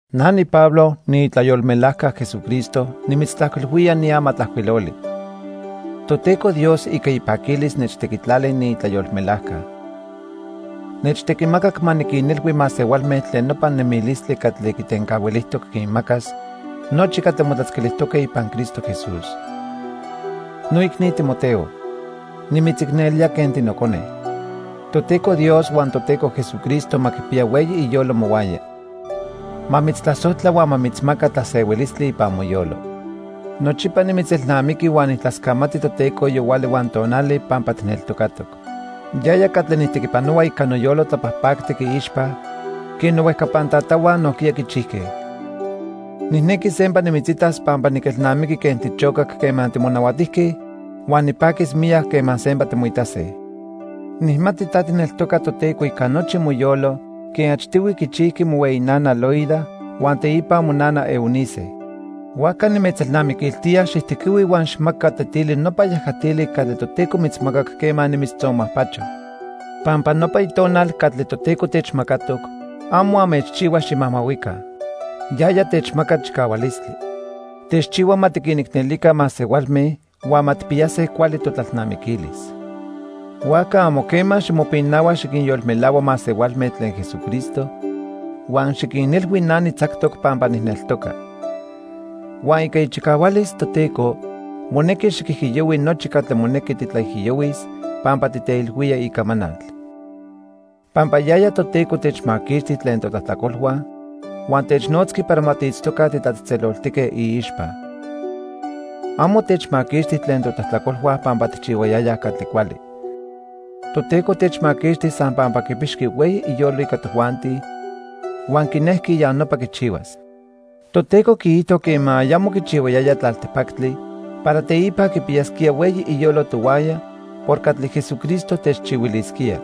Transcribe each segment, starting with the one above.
Na niPablo, niitlayolmelajca Jesucristo nimitztlajcuilhuía ni amatlajcuiloli. Toteco Dios ica ipaquilis nechtequitlali niitlayolmelajca. Nechtequimacac ma niquinilhui masehualme tlen nopa nemilistli catli quitencahuilijtoc quinmacas nochi catli motlatzquiltijtoque ipan Cristo Jesús. Noicni Timoteo, nimitzicnelía quen tinocone. Toteco Dios huan Toteco Jesucristo ma quipiya hueyi iyolo mohuaya. Ma mitztlasojtla huan ma mitzmaca tlasehuilistli ipan moyolo. Nochipa nimitzelnamiqui huan nijtlascamati Toteco yohuali huan tonali pampa tijneltocatoc. Yaya catli nijtequipanohua ica noyolo tlapajpactic iixpa quen nohuejcapan tatahua nojquiya quichijque. Nijnequi sempa nimitzitas pampa niquelnamiqui quen tichocac quema timonahuatijque huan nipaquis miyac quema sempa timoitase. Nijmati ta tijneltoca Toteco ica nochi moyolo quen achtihui quichijqui mohueyi nana, Loida, huan teipa monana, Eunice. Huajca nimitzelnamiquiltía xijtequihui huan xijmaca tetili nopa yajatili catli Toteco mitzmacac quema nimitztzonmajpacho. Pampa nopa tonal catli Toteco techmacatoc amo anmechchihua ximajmahuica. Yaya techmaca chicahualistli. Techchihua ma tiquinicnelica masehualme huan ma tijpiyase cuali totlalnamiquilis. Huajca amo quema ximopinahua xiquinyolmelahua masehualme tlen Jesucristo huan xiquinilhui na nitzactoc pampa nijneltoca. Huan ica ichicahualis Toteco monequi xiquijiyohui nochi catli monequi titlaijiyohuis pampa titeilhuía icamanal. Pampa yaya Toteco techmaquixti tlen totlajtlacolhua huan technotzqui para ma tiitztoca titlatzejtzeloltique iixpa. Amo techmaquixti tlen totlajtlacolhua pampa tijchihuayayaj catli cuali. Toteco techmaquixti san pampa quipixqui hueyi iyolo ica tojuanti huan quinejqui ya nopa quichihuas. Toteco quiijto quema ayamo quichihuayaya tlaltipactli para teipa quipiyasquía hueyi iyolo tohuaya por catli Jesucristo techchihuilisquía.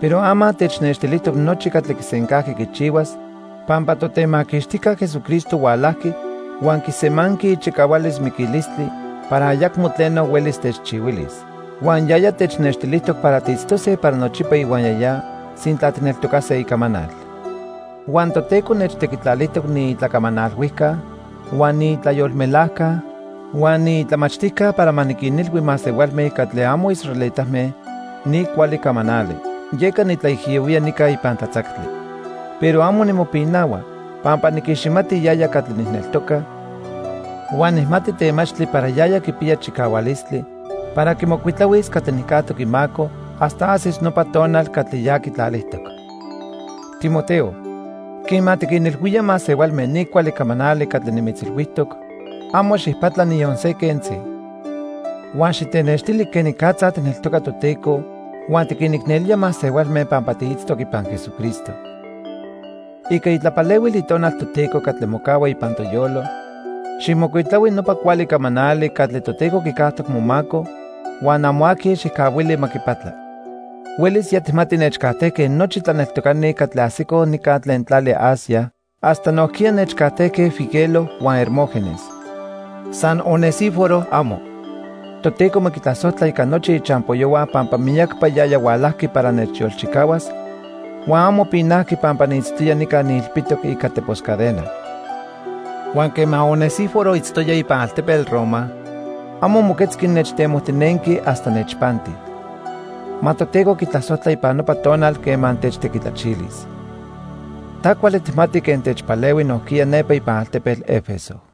Pero ama technextilijtoc nochi catli quisencajqui quichihuas pampa Totemaquixtijca Jesucristo hualajqui huan quisemanqui ichicahualis miquilistli para ayacmo tleno huelis techchihuilis. Huan yaya technextilijtoc para tiitztose para nochipa ihuaya ya sintla tijneltocase icamanal. Huan Toteco nechtequitlalijtoc niitlacamanalhuijca huan niitlayolmelajca huan niitlamachtijca para ma niquinilhui masehualme catli amo israelitame ni cuali camanali. Yeca nitlaijiyohuía nica ipan tlatzactli. Pero amo nimopinahua, pampa niquiximati yaya catli nijneltoca huan nijmati temachtli para yaya quipiya chicahualistli para quimocuitlahuis catli nijcajtoc imaco hasta ajsis nopa tonal catli ya quitlalijtoc. Timoteo, quema tiquinilhuía masehualme ni cuali camanali catli nimitzilhuijtoc, amo xijpatla niyon se quentzi. Huan xitenextili quenicatza tijneltoca Toteco huan tiquinicnelía masehualme pampa tiitztoc ipan Jesucristo. Ica itlapalehuil Itonal Toteco catli mocahua ipan toyolo, xijmocuitlahui nopa cuali camanali catli Toteco quicajtoc momaco, huan amo aqui xijcahuili ma quipatla. Huelis ya tijmati nechcajtejque nochi tlaneltocani catli ajsicoj nica tlen tlali Asia, hasta nojquiya nechcajtejque Figelo huan Hermógenes. San Onesíforo, amo. Toteco ma quitlasojtla ica nochi ichampoyohua pampa miyacpa yaya hualajqui para nechyolchicahuas, huan amo pinajqui pampa niitztoya nica niilpitoc ica tepos cadena. Huan quema Onesíforo itztoya ipan altepetl Roma, amo moquetzqui nechtemojtinenqui hasta nechpanti. Ma Toteco quitlasojtla ipan nopa tonal quema techtequitlachilis. Ta cuali tijmati quen techpalehui nojquiya nepa ipan altepetl 'Efeso.